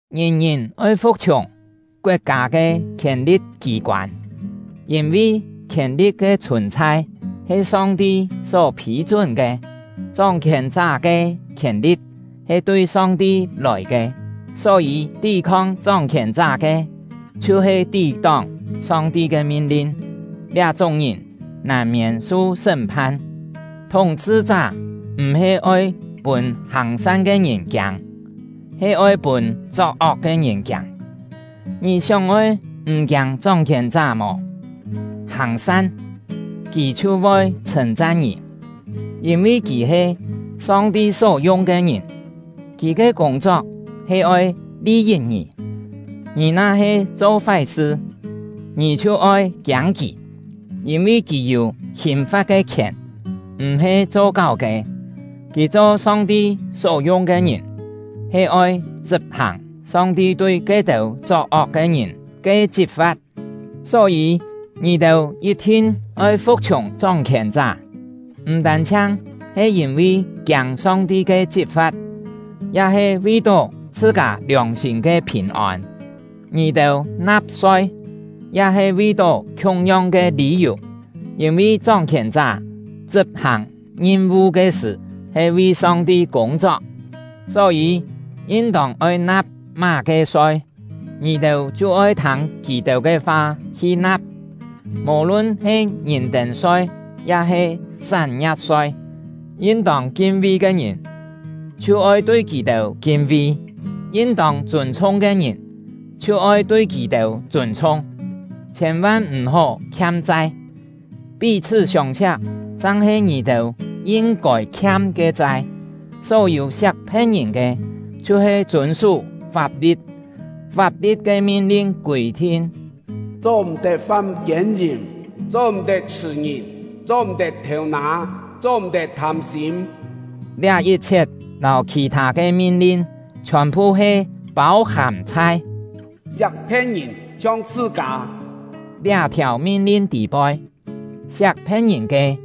Ngìn-ngìn oi fu̍k-chhiùng koet-kâ ke khièn-li̍t kî-koân, yîn-vi khièn-li̍t ke chhùn-chhai he Song-ti só phî-chún ke; chóng-khièn-chá ke khièn-li̍t he tui Song-ti lòi ke. Só-yî, tí-khong chóng-khièn-chá ke chhiu-he tí-tóng Song-ti ke min-lin; liá-chúng ngìn nàn-miên su sṳ́m-phan. Thúng-chhṳ-chá m̀-he oi pûn hàng-san ke ngìn kiâng, he oi pûn chok-ok ke ngìn kiâng. Ngì sióng-oi m̀ kiâng chóng-khièn-chá mò? Hàng-san, kì chhiu voi chhṳ̂n-chan ngì; yîn-vi kì he Song-ti só-yung ke ngìn, kì ke kûng-chok he oi li-yit ngì. Ngì na-he cho fái-sṳ, ngì chhiu oi kiâng kì, yîn-vi kì yû hìn-fa̍t ke khièn m̀-he cho-káu ke. Kì cho Song-ti só-yung ke ngìn, he oi chṳp-hàng Song-ti tui ke-têu chok-ok ke ngìn ke chit-fa̍t. Só-yî, ngì-têu yit-thin oi fu̍k-chhiùng chóng-khièn-chá, m̀ tân-chhiang he yîn-vi kiâng Song-ti ke chit-fa̍t, ya he vi-tó chhṳ-kâ liòng-sîm ke phìn-ôn. Ngì-têu na̍p-soi, ya he vi-tó khiung-yong ke lî-yù, yîn-vi chóng-khièn-chá chṳp-hàng ngim-vu ke sṳ̀ he vi Song-ti kûng-chok. Só-yî, yin-tông oi na̍p má-ke soi, ngì-têu chhiu oi thâng kì-têu ke fa hi na̍p, mò-lun he ngìn-tên-soi ya-he sán-ngia̍p-soi; yin-tông kin-vi ke ngìn, chhiu oi tui kì-têu kin-vi; yin-tông chûn-chhung ke ngìn, chhiu oi tui kì-têu chûn-chhung. Chhiên-van m̀-hó khiam-chai! Pí-chhṳ́ siông-siak chang-he ngì-têu yin-kôi khiam ke chai. Só-yû siak phe̍t-ngìn ke, chhiu-he chûn-sú fap-li̍t. Fap-li̍t ke min-lin kûi-thin: “Cho-m̀-tet fam kiên-yìm; cho-m̀-tet chhṳ̀-ngìn; cho-m̀-tet thêu-nâ; cho-m̀-tet thâm-sîm.” Liá yit-chhiet lâu khì-thâ ke min-lin chhiòn-phu he pâu-hàm chhai “Siak phe̍t-ngìn chhiong chhṳ-kâ” liá-thiàu min-lin tî-poi. Siak phe̍t-ngìn ke,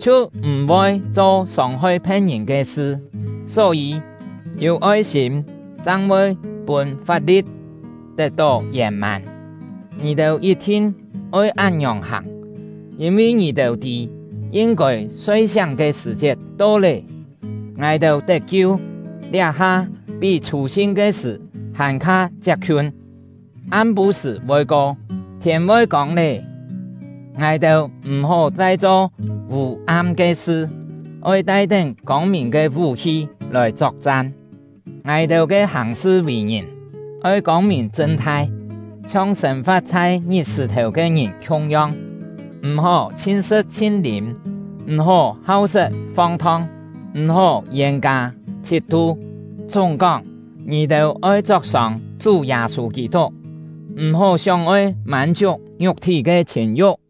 chhiu m̀-voi cho sông-hoi phe̍t-ngìn ke sṳ; só-yî, yû oi-sîm chang voi pûn fap-li̍t tet-tó yèn-mân. Ngì-têu yit-thin oi án-ngiòng hàng, yîn-vi ngì-têu tî yin-kôi soi-siáng ke sṳ̀-chiet to lé. Ngài-têu tet-kiu, liá-ha pí chhû-sin ke sṳ̀ hàn-kha chiap-khiun. Am-pû-sṳ̀ voi ko, thiên voi kông lé. Ngài-têu m̀-hó chai cho vû-am ke sṳ; oi tai-tén kông-mìn ke vú-hi lòi chok-chan. Ngài-têu ke hàng-sṳ vì-ngìn oi kông-mìn chṳn-thai, chhiong sên-fa̍t chhai ngit-sṳ̀-thèu ke ngìn khiung-yong. M̀-hó chhin-sṳ̍t chhin-lîm, m̀-hó hau-set fong-thong, m̀-hó yên-kâ chhit-tu. Chúng-kóng, ngì-têu oi chok-sông Chú Yâ-sû Kî-tuk; m̀-hó sióng-oi mân-chiuk ngiuk-thí ke chhìn-yu̍k!